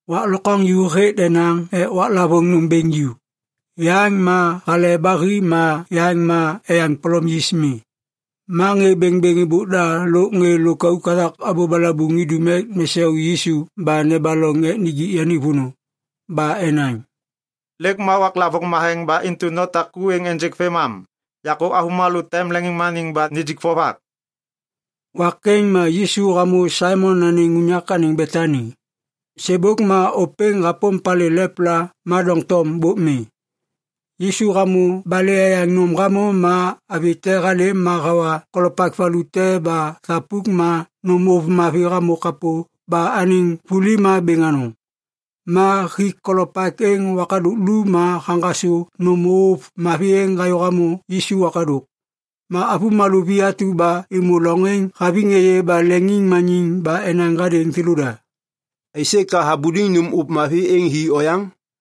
Wak lokwaŋju hêk denaŋ ek waklavôŋ nôm bêŋ ju, yaŋ ma Hale ba Hi ma yaŋ ma Eyaŋ Polom Yis Mi. Ma ŋê bêŋbêŋ êbôk da lôk ŋê lôkauk hathak abô balabuŋ idum ek nesau Yisu ba nebaloŋ ek nijik yani vônô. Ba enaŋ, “Lêk ma waklavôŋ matheŋ ba intu natak ku êŋ ênjêk vêmam. Yakô avômalô tem leŋiŋmaniŋ ba nijik vovak.” Wak êŋ ma Yisu hamô Saimon anêŋ unyak anêŋ Betani. Sêbôk ma ôpêŋ hapôm palê lepla ma doŋtom bôk mi. Yisu hamô balê eyaŋ nôm hamô ma avi te halêm ma hawa kolopak valu te ba thapuk ma nôm ôv mavi hamô kapô ba anêŋ vuli ma bêŋ anôŋ. Ma hik kolopak êŋ wakadôk lu ma haŋgasô nôm ôv mavi êŋ hayô hamô Yisu wakadôk. Ma avômalô vi atu ba êmô loŋ êŋ haviŋ êyê ba leŋiŋmaniŋ ba enaŋ hadêŋ thêlôda, “Aisê ka habuliŋ nôm ôv mavi êŋ hi oyaŋ?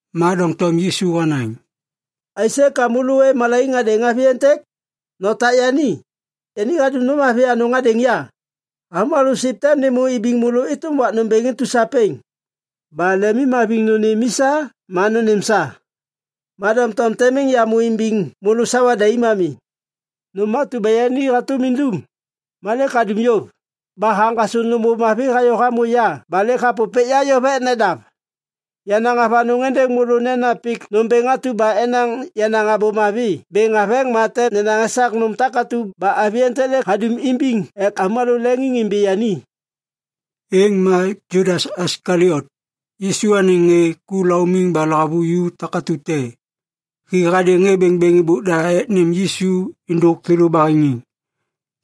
Ma doŋtom Yisu hanaŋ, “Aisê ka môlô ôêv malaiŋ hadêŋ avi êntêk? Notak yani. Yani hadum nôm mavi anôŋ hadêŋ ya. Avômalô siv tem nêmô imbiŋ môlô êtôm wak nômbêŋ intu sapêŋ, ba lemimhaviŋ nônêm i sa ma nônêm sa. Ma doŋtom tem miŋ yamô imbiŋ môlô sawa daim ami. Nôm atu ba yani hatôm indum, ma lêk hadum yôv, ba haŋgasô nôm ôv mavi hayô hamô ya ba lêk hapôpêk ya yôv ek nedav. Yanaŋ avanôŋ êndêŋ môlô nena pik nômbêŋ atu ba enaŋ yenaŋ Abô Mavi bêŋ haveŋ ma tem nenaŋ esak nôm atu ba avi êntêk lêk hadum imbiŋ ek avômalô leŋiŋimbi yani.” Êŋ ma Judas Iskaliot, Yisu anêŋ ŋê ku laumiŋ ba lahavuju takatu te, hi hadêŋ ŋê bêŋbêŋ êbôk da ek nêm Yisu êndôk thêlô baheŋiŋ.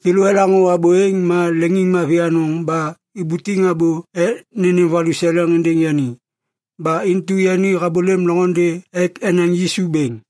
Thêlô elaŋô abô êŋ ma leŋiŋmavi anôŋ ba ibutiŋ abô ek nênêm valuseleŋ êndêŋ yani. Ba intu yani habôlêm loŋôndê ek enaŋ Yisu bêŋ.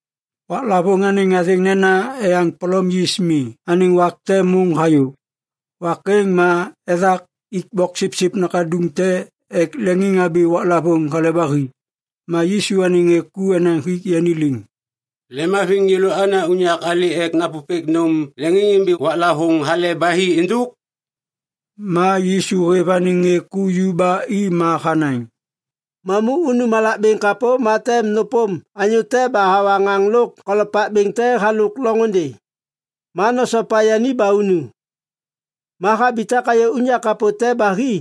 Waklavôŋ anêŋ athêŋ nena Eyaŋ Polom Yis Mi anêŋ wak te môŋ hayô. Wak êŋ ma ethak ik boksipsip nakaduŋ te ek leŋiŋhabi waklavôŋ Hale ba Hi. Ma Yisu anêŋ ŋê ku enaŋ hik yani liŋ, “Lemhaviŋ yêlô ana unyak alê ek napôpêk nôm leŋiŋimbi waklavôŋ Hale ba Hi êndôk?” Ma Yisu hêv anêŋ ŋê ku ju ba i ma hanaŋ, “Mamu unu malak bêŋ kapô ma tem nôpôm anyô te ba hawa ŋaŋ lôk kolopak bêŋ te halôk loŋôndê, ma nosopa yani ba unu. Ma habitak hayô unyak kapô te ba hi,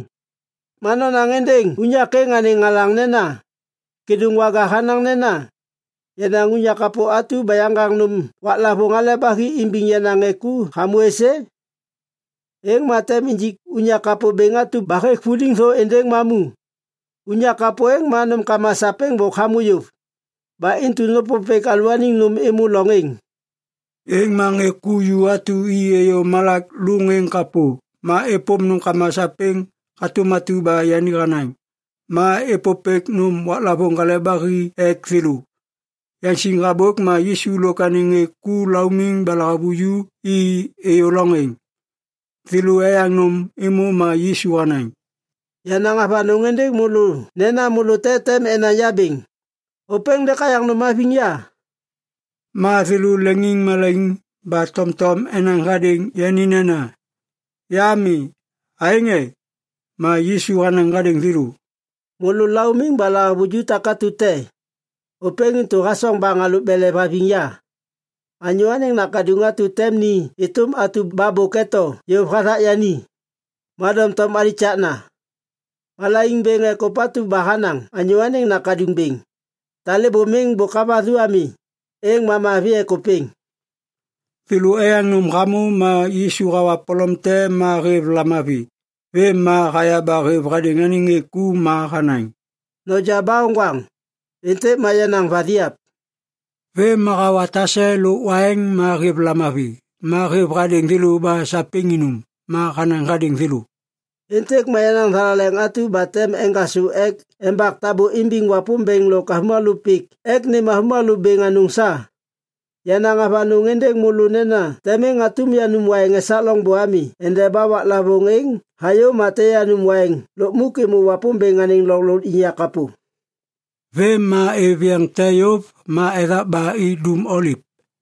ma nonaŋ êndêŋ unyak êŋ anêŋ alaŋ nena, ‘Kêdôŋwaga hanaŋ nena, “Yenaŋ unyak kapô atu ba yaŋgaŋ nôm waklavôŋ Hale ba Hi imbiŋ yenaŋ ŋê ku hamô êsê?” ’ Êŋ ma tem injik unyak kapô bêŋ atu ba hêk vuliŋ thô êndêŋ mamu. Unyak kapô êŋ ma nômkama sapêŋ bôk hamô yôv. Ba intu nôpôpêk alalôaniŋ nôm êmô loŋ êŋ.” Êŋ ma ŋê ku ju atu i êyô malak lôŋ êŋ kapô. Ma êpôm nômkama sapêŋ hatôm atu ba yani hanaŋ. Ma êpôpêk nôm waklavôŋ Hale ba Hi ek thêlô. Yaŋsiŋ habôk ma Yisu lôk anêŋ ŋê ku laumiŋ ba lahavuju i êyô loŋ êŋ. Thêlô eyaŋ nôm êmô ma Yisu hanaŋ, “Yanaŋ avanôŋ êndêŋ môlô nena môlô te tem enaŋ ya bêŋ. Ôpêŋ lêk hayaŋ nôm haviŋ ya.” Ma thêlô leŋiŋmalaiŋ ba tomtom enaŋ hadêŋ yani nena, “Ya mi, aêŋ e?” Ma Yisu hanaŋ hadêŋ thêlô, “Môlô laumiŋ ba lahavuju takatu te. Ôpêŋ intu hasoŋ baŋ halôk belev haviŋ ya. Anyô Anêŋ Nakaduŋ atu tem ni êtôm atu ba bôk eto yôv hathak yani. Ma doŋtom alikakna. Malaiŋ bêŋ ek ôpatu ba hanaŋ Anyô Anêŋ Nakaduŋ bêŋ. Talêbô miŋ bôk havathu ami, êŋ ma mavi ek ôpêŋ!” Thêlô eyaŋ nôm hamô ma Yisu hawa polom te ma hêv lamavi. Vêm ma haya ba hêv hadêŋ anêŋ ŋê ku ma hanaŋ, “Noja ba oŋgwaŋ. Êntêk ma yenaŋ vathiap.” Vêm ma hawa tase lôk waiŋ ma hêv lamavi. Ma hêv hadêŋ thêlô ba sapêŋ inum. Ma hanaŋ hadêŋ thêlô, “Êntêk ma yenaŋ thalaleŋ atu ba tem eŋgasô ek embak tabô imbiŋ Wapômbêŋ lôk avômalô pik ek nêm avômalô bêŋ anôŋ sa. Yanaŋ avanôŋ êndêŋ môlô nena tem miŋ hatôm yanum waiŋ esak loŋbô ami endeba waklavôŋ êŋ hayô ma tem yanum waiŋ lukmuk êmô Wapômbêŋ anêŋ loŋ lôkliŋyak kapô.” Vêm ma êv yeŋ te yôv ma ethak ba i Dum Oliv.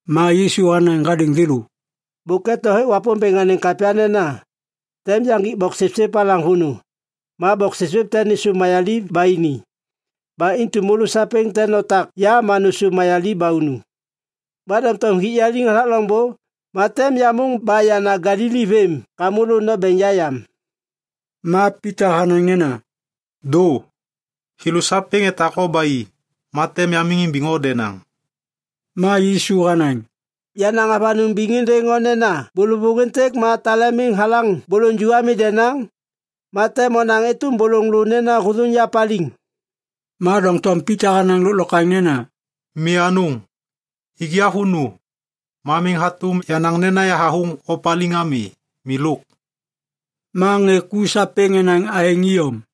Ma Yisu hanaŋ hadêŋ thêlô, “Bôk eto hêk Wapômbêŋ anêŋ kapya nena, “‘Tem yaŋgik boksipsip alaŋ vônô, ma boksipsip tem nêsôv mayaliv ba ini.’ Ba intu môlô sapêŋ tem notak ya ma nôsôv mayaliv ba unu. Ma doŋtom hik ya liŋ hathak loŋbô, ma tem yamôŋ ba yana Galili vêm ka môlô nombeŋ ya yam.” Ma Pita hanaŋ nena, “Dô! Thêlô sapêŋ etak o ba i, ma tem yamiŋ imbiŋ o denaŋ.” Ma Yisu hanaŋ, “Yanaŋ avanôŋ biŋ êndêŋ o nena bôlôvôŋ êntêk ma tale miŋ halaŋ bôlôŋ ju ami denaŋ, ma tem onaŋ êtôm bôlôŋ lô nena hôthôŋ ya paliŋ.” Ma doŋtom Pita hanaŋ lôklokwaŋ nena, “Mi anôŋ! Ik ya vônô, ma miŋ hatôm yanaŋ nena yahathôŋ o paliŋ ami. Milôk!” Ma ŋê ku sapêŋ enaŋ aêŋ iyom.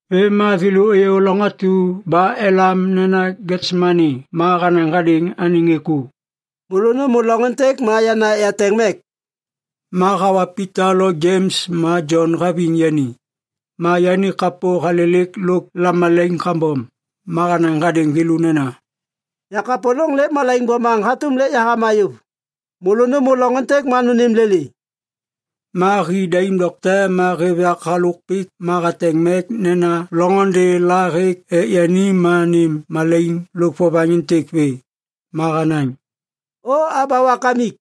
Vêm ma thêlô êyô loŋ atu ba elam nena Getsemani ma hanaŋ hadêŋ anêŋ ŋê ku, “Môlô nômô loŋ êntêk ma yana ek yateŋ mek.” Ma hawa Pita lo Jems ma Jon haviŋ yani. Ma yani kapô halêlêk lôk lamalaiŋ kambom. Ma hanaŋ hadêŋ thêlô nena, “Yakapôlôŋ lêk malaiŋ bomaŋ hatôm lêk yahama yôv. Môlô nômô loŋ êntêk ma nônêm lêlê.” Ma hi daim dokte ma hêv yak halôk pik ma hateŋ mek nena loŋôndê la hêk ek yani ma nêm malaiŋ lôk vovaŋ êntêk vê. Ma hanaŋ, “O Aba Wakamik,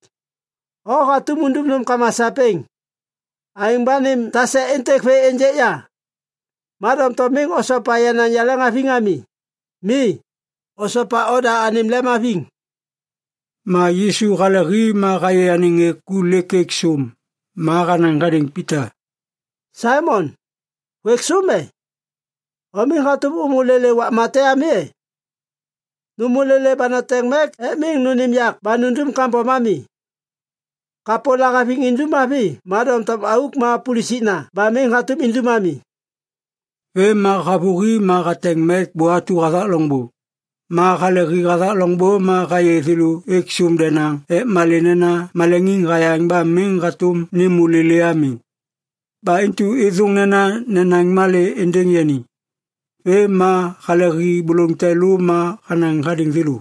o hatôm undum nômkama sapêŋ. Aêŋ ba nêm tase êntêk vê ênjêk ya. Ma doŋtom miŋ osopa yenaŋ yaleŋhaviŋ ami. Mi, osopa oda anêm lemhaviŋ.” Ma Yisu hale hi ma hayê anêŋ ŋê ku lêk êk sôm. Ma hanaŋ hadêŋ Pita, “Saimon, hôêk sôm e? O miŋ hatôm ômô lêlê wakma te ami e? Nômô lêlê ba noteŋ mek ek miŋ nônêm yak ba nundum kambom ami. Kapô lahaviŋ indum mavi ma doŋtom auk ma pulusikna ba miŋ hatôm indum ami.” Vêm ma havôhi ma hateŋ mek bô atu hathak loŋbô. Ma halehi hathak loŋbô ma hayê thêlô êk sôm denaŋ ek malê nena maleŋiŋ hayaŋ ba miŋ hatôm nêmô lêlê ami. Ba intu êthôŋ nena nenaŋ malê êndêŋ yani. Vêm ma halehi bôlôŋ te lô ma hanaŋ hadêŋ thêlô,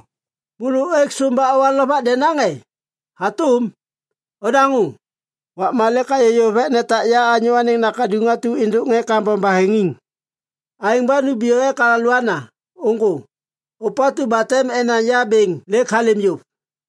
“Môlô ôêk sôm ba owa lovak denaŋ e? Hatôm! Odaŋô, wakma lêk hayô yôv ek netak ya Anyô Anêŋ Nakaduŋ atu êndôk ŋê kambom baheŋiŋ. Aêŋ ba numbiyô ek alôana. Ôŋgô! Ôpatu ba tem enaŋ ya bêŋ lêk halêm yôv.”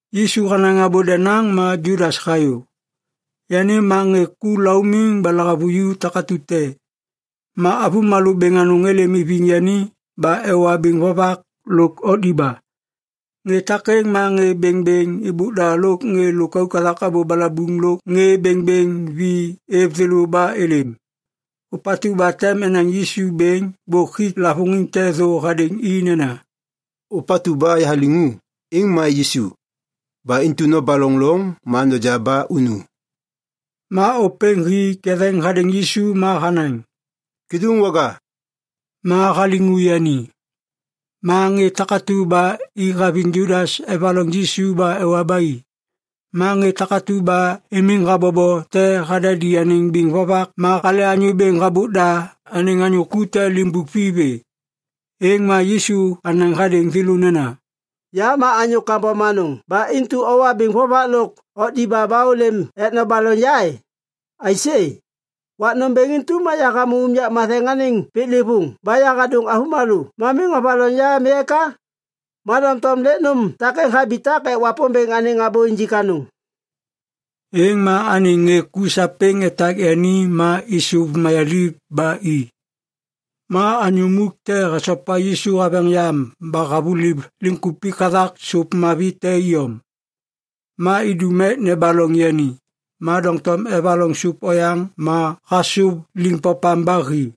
Yisu hanaŋ abô denaŋ ma Judas hayô. Yani ma ŋê ku laumiŋ ba lahavuju takatu te. Ma avômalô bêŋ anôŋ êlêm iviŋ yani ba ewa biŋ vovak lôk okdiba. Ŋê takêŋ ma ŋê bêŋbêŋ êbôk da lôk ŋê lôkauk hathak abô balabuŋ lôk ŋê bêŋbêŋ vi êv thêlô ba êlêm. Ôpatu ba tem enaŋ Yisu bêŋ bôk hik lavôŋiŋ te thô hadêŋ i nena, “Ôpatu ba yahaliŋu, êŋ ma Yisu. Ba intu nobaloŋ loŋ ma noja ba unu.” Ma ôpêŋ hi ketheŋ hadêŋ Yisu ma hanaŋ, “Kêdôŋwaga.” Ma haliŋu yani. Ma ŋê takatu ba i haviŋ Judas evaloŋ Yisu ba ewa ba i. Ma ŋê takatu ba imiŋ habobo te hadadi anêŋ biŋ vovak ma hale anyô bêŋ habôk da anêŋ anyô ku te limbuk vi vê. Êŋ ma Yisu hanaŋ hadêŋ thêlô nena, “Ya ma anyô kambom anôŋ ba intu owa biŋ vovak lôk okdiba ba ôlêm ek nobaloŋ ya e? Aisê? Wak nômbêŋ intu ma yahamô unyak matheŋ anêŋ piklêvôŋ ba yahadôŋ môlô ma miŋ ovaloŋ ya ami eka? Ma doŋtom lêk nôm takêŋ habitak ek Wapômbêŋ anêŋ abô injik anôŋ.” Êŋ ma anêŋ ŋê ku sapêŋ etak yani ma êsôv mayaliv ba i. Ma anyô muk te hasopa Yisu haveŋ yam ba havuliv liŋkupik hathak sôp mavi te iyom. Ma idum ek nebaloŋ yani, ma doŋtom evaloŋ sôp oyaŋ ma hasôv liŋpopam ba hi.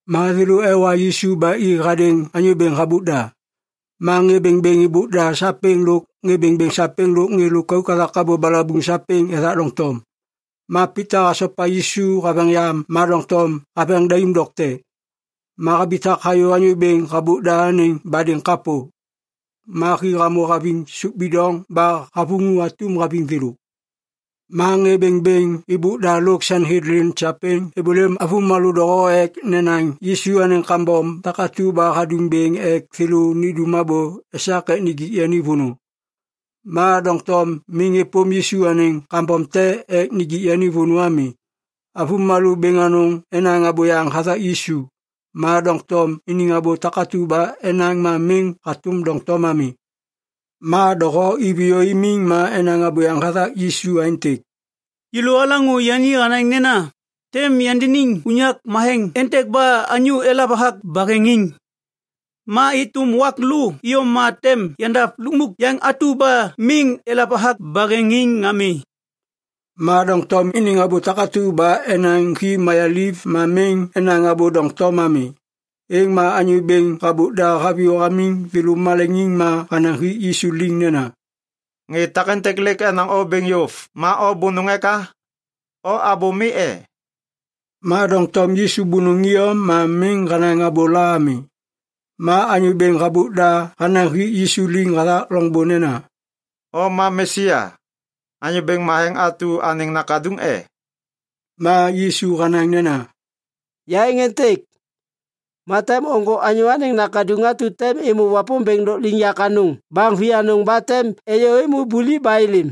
Ma thêlô ewa Yisu ba i hadêŋ anyô bêŋ habôk da. Ma ŋê bêŋbêŋ êbôk da sapêŋ lôk ŋê bêŋbêŋ sapêŋ lôk ŋê lôkauk hathak abô balabuŋ sapêŋ ethak doŋtom. Ma Pita hasopa Yisu haveŋ yam ma doŋtom haveŋ daim dokte. Ma habitak hayô anyô bêŋ habôk da anêŋ badêŋ kapô. Ma hi hamô haviŋ sôp bidoŋ ba havuŋu atum haviŋ thêlô. Ma ŋê bêŋbêŋ êbôk da lôk Sanhedlin sapêŋ êbôlêm avômalô doho ek nenaŋ Yisu anêŋ kambom takatu ba hadum bêŋ ek thêlô nindum abô esak ek nijik yani vônô. Ma doŋtom miŋ êpôm Yisu anêŋ kambom te ek nijik yani vônô ami. Avômalô bêŋ anôŋ enaŋ abôyaŋ hathak Yisu, ma doŋtom iniŋ abô takatu ba enaŋ ma miŋ hatôm doŋtom ami. Ma doho iviyô imiŋ ma enaŋ abôyaŋ hathak Yisu aêntêk, “Yêlô alaŋô yani hanaŋ nena, ‘Tem yandiniŋ unyak matheŋ êntêk ba anyô elav hathak baheŋiŋ. Ma êtôm wak lô iyom ma tem yandav lukmuk yaŋ atu ba miŋ elav hathak baheŋiŋ ami.’” Ma doŋtom iniŋ abô takatu ba enaŋ hi mayaliv ma miŋ enaŋ abô doŋtom ami. Êŋ ma anyô bêŋ habôk da haviyô hamiŋ thêlô maleŋiŋ ma hanaŋ hik Yisu liŋ nena, “Ŋê takêntêk lêk enaŋ o bêŋ yôv ma o bônôŋ eka? O abô mi e?” Ma doŋtom Yisu bônôŋ iyom ma miŋ hanaŋ abôla ami. Ma anyô bêŋ habôk da hanaŋ hik Yisu liŋ hathak loŋbô nena, “O ma Mesia, Anyô Bêŋ Matheŋ atu anêŋ Nakaduŋ e?” Ma Yisu hanaŋ nena, “Ya êŋ êntêk. Ma tem ôŋgô Anyô Anêŋ Nakaduŋ atu tem êmô Wapômbêŋ Lôkliŋyak Anôŋ baŋ vianôŋ ba tem êyô êmô buliv ba êlêm.”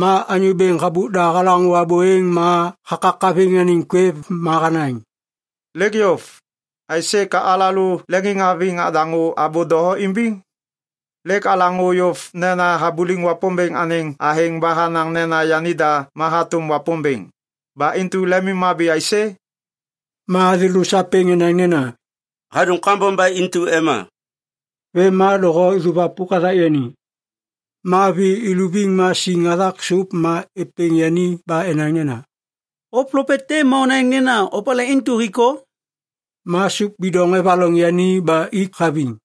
Ma anyô bêŋ habôk da halaŋô abô êŋ ma hakakaviŋ anêŋ kwêv ma hanaŋ, “Lêk yôv. Aisê ka alalô leŋiŋhaviŋ nadaŋô abô doho imbiŋ? Lêk alaŋô yôv nena habuliŋ Wapômbêŋ anêŋ athêŋ ba hanaŋ nena yanida ma hatôm Wapômbêŋ. Ba intu lemimhabi aisê?” Ma thêlô sapêŋ enaŋ nena, “Hadum kambom ba intu ema.” Vêm ma doho êsôvwapôk hathak yani. Ma vi ivuliv ma siŋ hathak sôp ma êpêŋ yani ba enaŋ nena, “O plopet te ma onaŋ nena opalê intu hik o?” Ma sôp bidoŋ evaloŋ yani ba ik haviŋ.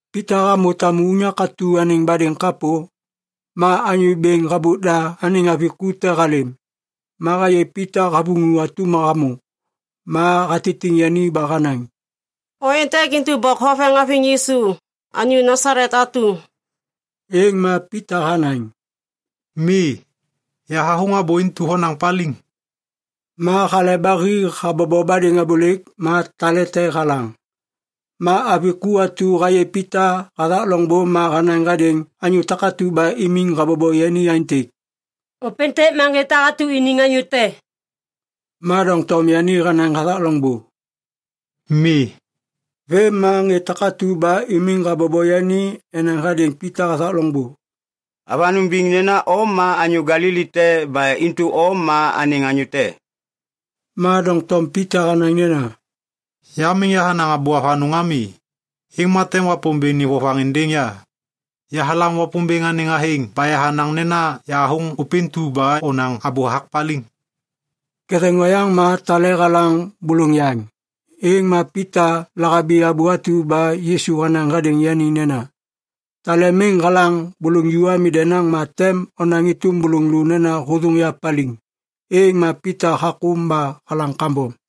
Pita hamô tamu unyak atu anêŋ badêŋ kapô, ma anyô bêŋ habôk da anêŋ avi ku te halêm. Ma hayê Pita havuŋu atum hamô. Ma hatitiŋ yani ba hanaŋ, “O êntêk intu bôk hoveŋ haviŋ Yisu, anyô Nasalet atu.” Êŋ ma Pita hanaŋ, “Mi, yahathôŋ abô intu ba honaŋ paliŋ.” Ma hale ba hi habobo badêŋ abôlêk. Ma tale te halaŋ. Ma avi ku atu hayê Pita hathak loŋbô ma hanaŋ hadêŋ anyô takatu ba imiŋ habobo yani aêntêk, “Ôpêntêk ma ŋê takatu iniŋ anyô te.” Ma doŋtom yani hanaŋ hathak loŋbô, “Mi.” Vêm ma ŋê takatu ba imiŋ habobo yani enaŋ hadêŋ Pita hathak loŋbô, “Avanôŋ biŋ nena o ma anyô Galili te ba intu o ma anêŋ anyô te.” Ma doŋtom Pita hanaŋ nena, “Ya miŋ yahanaŋ abô avanôŋ ami, êŋ ma tem Wapômbêŋ nêm vovaŋ êndêŋ ya. Yahalam Wapômbêŋ anêŋ athêŋ ba yahanaŋ nena yahathôŋ ôpêntu ba onaŋ abô hathak paliŋ.” Ketheŋ oyaŋ ma tale halaŋ bôlôŋ yaŋ, êŋ ma Pita lahabi abô atu ba Yisu hanaŋ hadêŋ yani nena, “Tale miŋ halaŋ bôlôŋ ju ami denaŋ, ma tem onaŋ êtôm bôlôŋ lô nena hôthôŋ ya paliŋ.” Êŋ ma Pita hakôm ba halaŋ kambom.